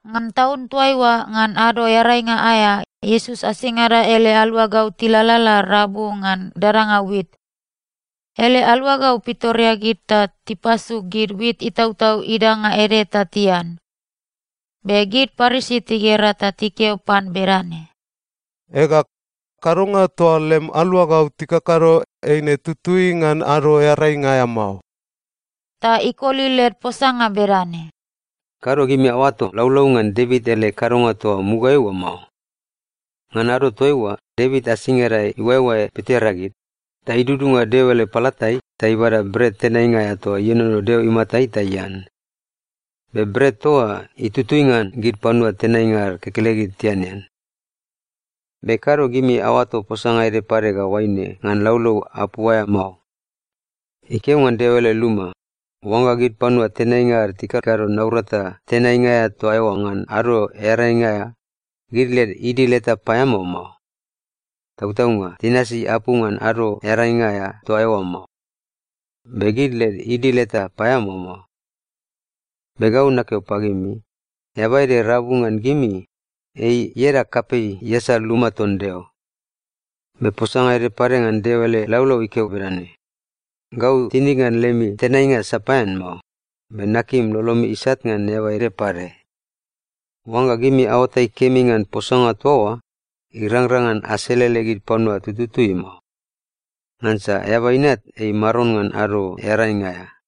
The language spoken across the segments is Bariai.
Ngan taun toaiua, ngan Ado Earainga aea, Iesus asingada ele aluagau tilalala rabu ngan dadanga wit. Ele aluagau pitoreagid ta tipasu gid wit itautau idanga ede ta tian. Be gid Parisi tigera ta tikeo pan bedane, “Ega, kadonga toa lem aluagau tikakado eine tutui ngan Ado Earainga aea mao.” Ta ikoli led posanga bedane, “Kado gimi aoato laulau ngan Devit ele kadonga toa mugaeai oa mao. Ngan ado toaiua, Devit asingada iuaeoae pitoreagid, ta idudunga Deo ele palatai ta ibada bret tenainga aea toa ienono Deo imatai ta ian. Be bret toa oa itutui ngan gid panua tenainga ad kekelegid tianean. “Be kado gimi aoato posanga ede pade ga oaine ngan laulau apu aea mao. Ikeo ngan Deo ele luma, oangga gid panua tenainga ad tikakado naurata tenainga aea toa eoa ngan Ado Earainga aea, gid led idil eta paeamao mao. Tautaunga tinasi apu ngan Ado Earainga aea toa eoa mao, be gid led idil eta paeamao mao. Be gau nakeo pagimi, eaba ede rabu ngan gimi, ei ieda kapei iasal luma ton Deo. Be posanga ede pade ngan Deo ele laulau ikeo bedane, ‘Gau tinig ngan lemi tenainga sapaean mao, be nakim lolomi isat ngan eaba ede pade.’ Oangga gimi aoatai kemi ngan posanga toa oa, irangrang ngan aselele gid panua tututui mao. Ngansa Eaba Inat ei Maron ngan Ado Earainga aea.”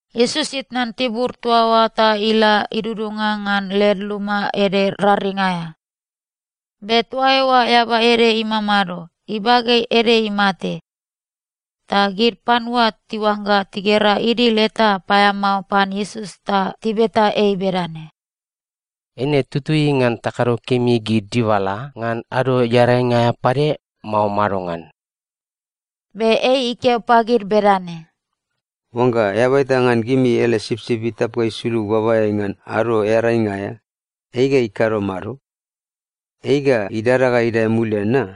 Iesus itnan tibur toa oa ta ila idudunga ngan led luma ede raring aea. Be toa eoa eaba ede imamado, ibage ede imate. Ta gid panua tiuangga tigera idil eta paeamao pan Iesus ta tibeta ei bedane, “Eine tutui ngan takado kemi gid dibala ngan Ado Earainga aea pade, mao madongan?” Be ei ikeo pagid bedane, “Oangga eaba eta ngan gimi ele sipsip itap ga isulug babaeai ngan Ado Earainga aea, ei ga ikado mado? Ei ga idada ga idae mulian na?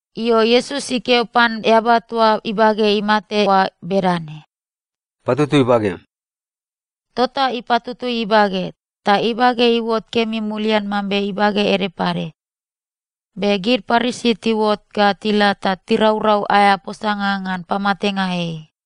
Io, Iesus ikeo pan eaba toa ibage imate oa bedane, “Patutui bagem.” Tota ipatutui ibage, ta ibage iuot kemi mulian mambe ibage ede pade. Be gid Parisi tiuot ga tila ta tiraurau aea posanga ngan pamatenga ei.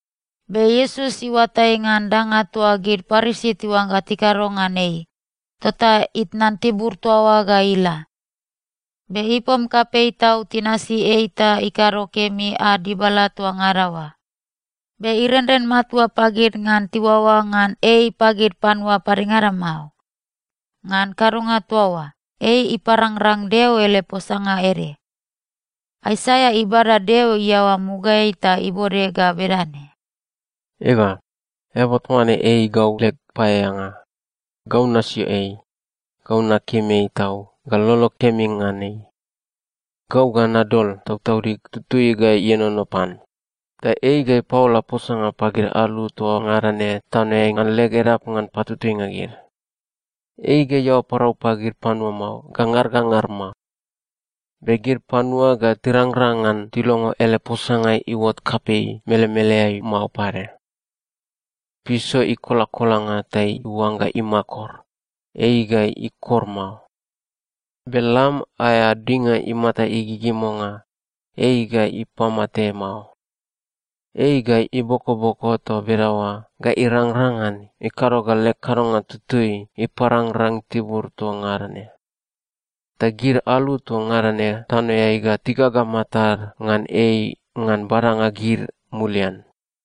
Be Iesus iuatai ngan danga toa gid Parisi tiuangga tikado ngan ei, tota itnan tibur toa oa ga ila. Be ipom kapei tau tinasi ei ta ikado kemi ad dibala toa ngada oa. Be irenren matua pagid ngan tiuaoa ngan ei pagid panua padengada mao. Ngan kadonga toa oa, ei iparangrang Deo ele posanga ede. Aisaia ibada Deo iaoa mugaeai ta ibode ga bedane, “Ega, eaba toa ne ei gau leg paeaeanga. Gau nasio ei. Gau nakim ei tau ga lolog kemi ngan ei. Gau ga nadol Tautaudig Tutui ga ienono pan, ta ei ga ipaola posanga pagid alu toa ngada ne tanoeai ngan leg edap ngan patutuinga gid. Ei ga iaoa parau pagid panua mao ga ngar ga ngar mao. Be gid panua ga tirangrang ngan tilongo ele posanga iuot kapei melemeleai mao pade. Piso ikolakolanga ta iuangga imakor, ei ga ikor mao. Be lam aea dinga imata igigimonga, ei ga ipamate mao. Ei ga ibokoboko toa bedaoa ga irangrang ngan ikado ga leg kadonga tutui iparangrang tibur toa ngada ne. Ta gid alu toa ngada ne tanoeai ga tigaga matad ngan ei ngan badanga gid mulian.”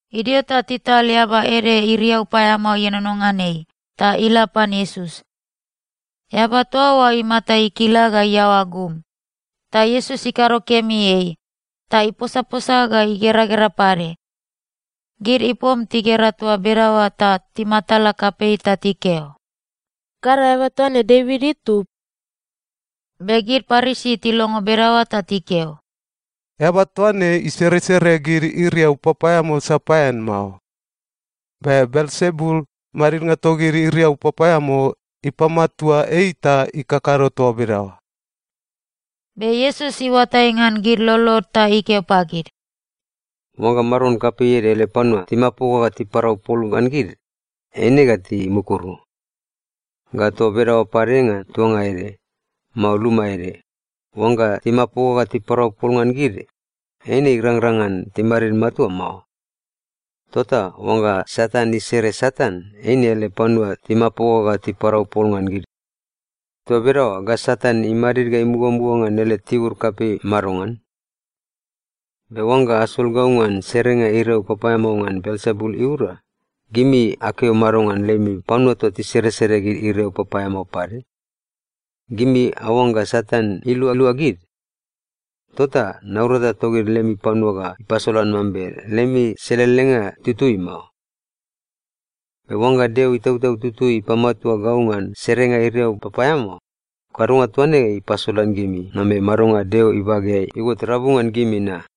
Idio ta tital eaba ede iriau paeamao ienono ngan ei, ta ila pan Iesus. Eaba toa oa imata ikila ga iaoa gum. Ta Iesus ikado kemi ei, ta iposaposa ga igeragera pade. Gid ipom tigera toa bedaoa ta timatala kapei ta tikeo, “Kado eaba toa ne Devit itub?” Be gid Parisi tilongo bedaoa ta tikeo, “Eaba toa ne iseresere gid iriau papaeamao sapaean mao. Be Belsebul, madidnga togid iriau papaeamao, ipamatua ei ta ikakado toa bedaoa.” Be Iesus iuatai ngan gid lolod ta ikeo pagid, “Oangga maron kapei ede ele panua timapoga ta tiparau pol ngan gid, eine ga timukuru. Ga toa bedaoa pade ngan tuanga ede, mao luma ede, oangga timapoga ta tiparau pol ngan gid, eine irangrang ngan timadid matua mao. Tota oangga Satan isere Satan, eine ele panua timapoga ta tiparau pol ngan gid. Toa bedaoa ga Satan imadid ga imugamuga ngan ele tibur kapei madongan? Be oangga asol gau ngan serenga iriau papaeamao ngan Belsebul iura, gimi akeo mado ngan lemi panua toa tiseresere gid iriau papaeamao pade? Gimi aoangga Satan ilualua gid? Tota naurata togid lemi panua ga ipasolan mambe lemi selelenga itutui mao. Be oangga Deo Itautau Tutui ipamatua gau ngan serenga iriau papaeamao, kadonga toa ne ipasolan gimi mambe madonga Deo ibageai iuot rabu ngan gimi na.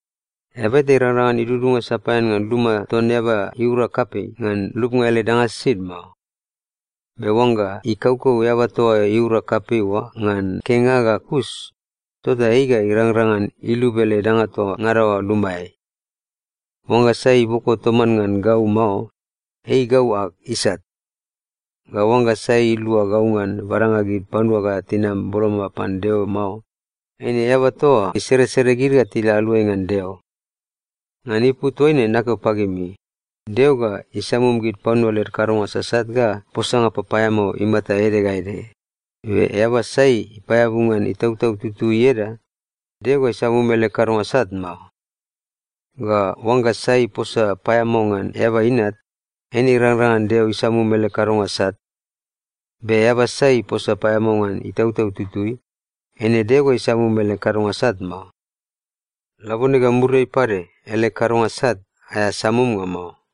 “Eaba eta irangrang ngan idudunga sapaean ngan luma ton eaba iura kapei, ngan lubnga ele danga sisid mao. Be oangga ikaukau eaba toa iura kapei oa ngan kenga ga kus, tota ei ga irangrang ngan ilub ele danga toa ngada oa lumaeai. “Oangga sai iboko toman ngan gau mao, ei gau ag isat. Ga oangga sai ilua gau ngan badanga gid panua ga tinam boloma pan Deo mao, eine eaba toa oa iseresere gid ga tila aluai ngan Deo. Ngan ipu toaine nakeo pagimi, Deo ga isamum gid panua led kadonga sasat ga posanga papaeamao imata ede ga ede, be eaba sai ipaeabu ngan Itautau Tutui ieda, Deo ga isamum ele kadonga sat mao. Ga oangga sai iposa paeamao ngan Eaba Inat, eine irangrang ngan Deo isamum ele kadonga sat. Be eaba sai iposa paeamao ngan Itautau Tutui, eine Deo ga isamum ele kadonga sat mao. Labone ga muriai pade, ele kadonga sat aea samumnga mao.”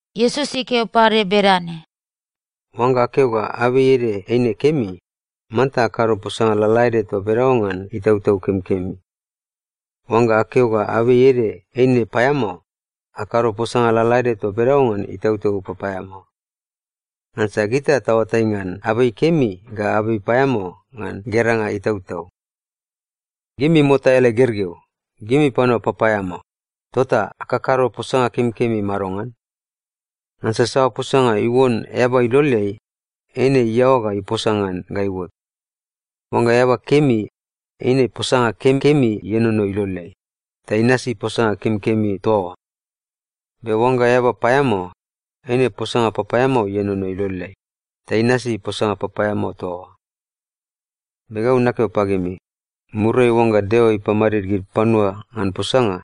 Iesus ikeo pade bedane, “Oangga akeo ga abei ede eine kemi, manta akado posanga lalaede toa bedaoa ngan itautau kemikemi. Oangga akeo ga abei ede eine paeamao, akado posanga lalaede toa bedaoa ngan itautau papaeamao. Ngansa gita taoatai ngan abei kemi ga abei paeamao ngan geranga itautau. Gimi mota ele gergeu! Gimi panua papaeamao, tota akakado posanga kemikemi madongan? Ngansa saoa posanga iuon eaba iloleai, eine iaoa ga iposa ngan ga iuot. Oangga eaba kemi, eine posanga kemikemi ienono iloleai, ta inasi posanga kemikemi toa oa. Be oangga eaba paeamao, eine posanga papaeamao ienono iloleai, ta inasi posanga papaeamao toa oa. Be gau nakeo pagimi, muriai oangga Deo ipamadid gid panua ngan posanga,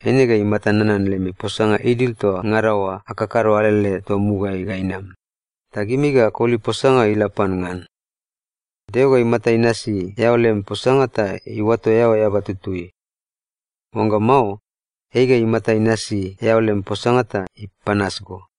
eine ga imata nanan lemi posanga idil toa ngada oa akakado alele toa mugaeai ga inam, ta gimi ga akoli posanga ga ila pan ngan. Deo ga imata inasi eao lem posanga ta iuato eao eaba tutui. Oangga mao, ei ga imata inasi eao lem posanga ta ipanas go.”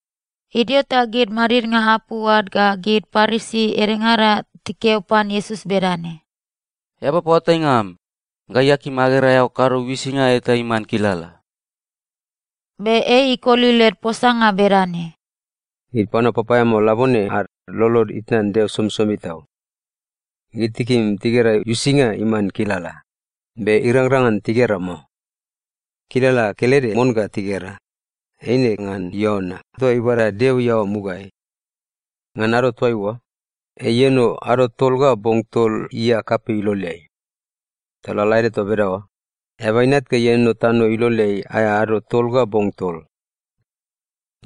Idio ta gid madidnga apu ad ga gid Parisi edengada tikeo pan Iesus bedane, “Eaba paoatainga am, gai akim agera eao kado uisinga eta iman kilala.” Be ei ikoli led posanga bedane, “Gid panua papaeamao labone ad lolod itnan Deo somisomi tau. Gid tikim tigera uisinga iman kilala. Be irangrang ngan tigera mao. Kilala kelede mon ga tigera, eine ngan Iona toa ibada Deo iaoa mugaeai. Ngan ado toaiua, ei ieno ado tol ga bong tol ia kapei iloleai. Ta lalaede toa bedaoa, Eaba Inat ga ieno tano iloleai aea ado tol ga bong tol.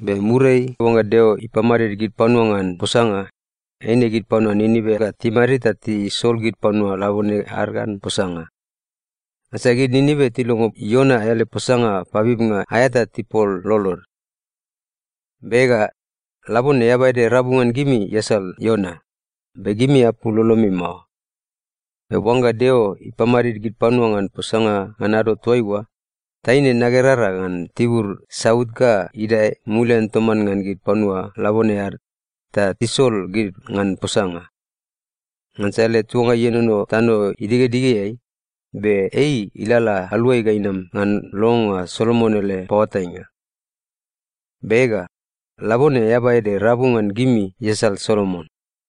Be muriai oangga Deo ipamadid gid panua ngan posanga, eine gid panua Ninive ga timadid ta tisol gid panua labone ad ngan posanga. Ngansa gid Ninive tilongo Iona ele posanga pabibnga aea ta tipul lolod. Be ega, labone eaba ede rabu ngan gimi iasal Iona, be gimi apul lolomi mao. Be oangga Deo ipamadid gid panua ngan posanga ngan ado toaiua, taine nagerara ngan tibur saut ga idae mulian toman ngan gid panua labone ad ta isol gid ngan posanga. Ngansa ele tuanga ienono tano idigedigeai, be ei ilalala aluai ga inam ngan longonga Solomon ele paoatainga. Be ega, labone eaba ede rabu ngan gimi iasal Solomon.”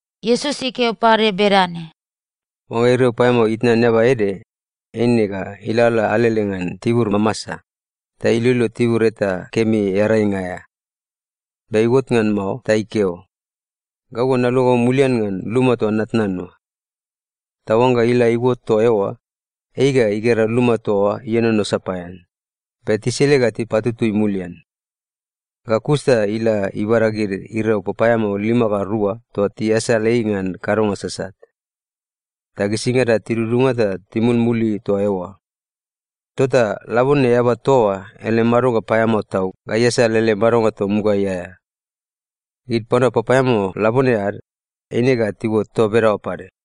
Iesus ikeo pade bedane, “Oangga iriau paeamao itnan eaba ede, eine ga ilalala alele ngan tibur mamasa, ta iloilo tibur eta kemi earainga aea. Be iuot ngan mao ta ikeo, ‘Gau ga naluagau mulian ngan luma toa natnan oa.’ Ta oangga ila iuot toa eoa, ei ga igera luma toa oa ienono sapaean, be tisile ga tipatutui mulian. Ga kus ta ila ibada gid iriau papaeamao lima ga rua toa tiasal ei ngan kadonga sasat. Ta gisingada tidudunga ta timulmuli toa eoa. Tota labone eaba toa oa ele madonga paeamao tau ga iasal ele madonga toa mugaeai aea. Gid panua papaeamao labone ad, eine ga tiuot toa bedaoa pade.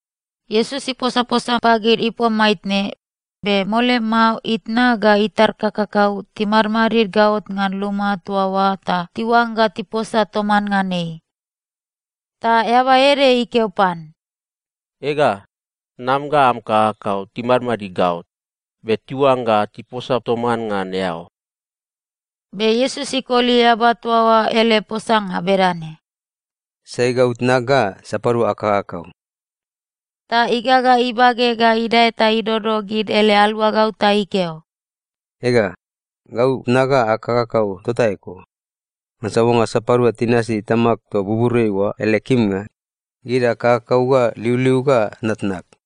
Iesus iposaposa pagid ipom maitne, be mole mao itna ga itar kakakau timadmadid gaot ngan luma toa oa ta tiuangga tiposa toman ngan ei. Ta eaba ede ikeo pan, “Ega, tnam ga am kakakau timadmadid gaot, be tiuangga tiposa toman ngan eao.” Be Iesus ikoli eaba toa oa ele posanga bedane, “Sai gau tnag, ga sapadua ag kakakau?” Ta igaga ibage ga idae ta idodo gid ele aluagau ta ikeo, “Ega, gau tnag ga ag kakakau tota eko. Ngansa oangga sapadua tinasi Tamag toa buburiai oa ele kimnga, gid gau ag kakakau ga liuliug ga tnatnag.”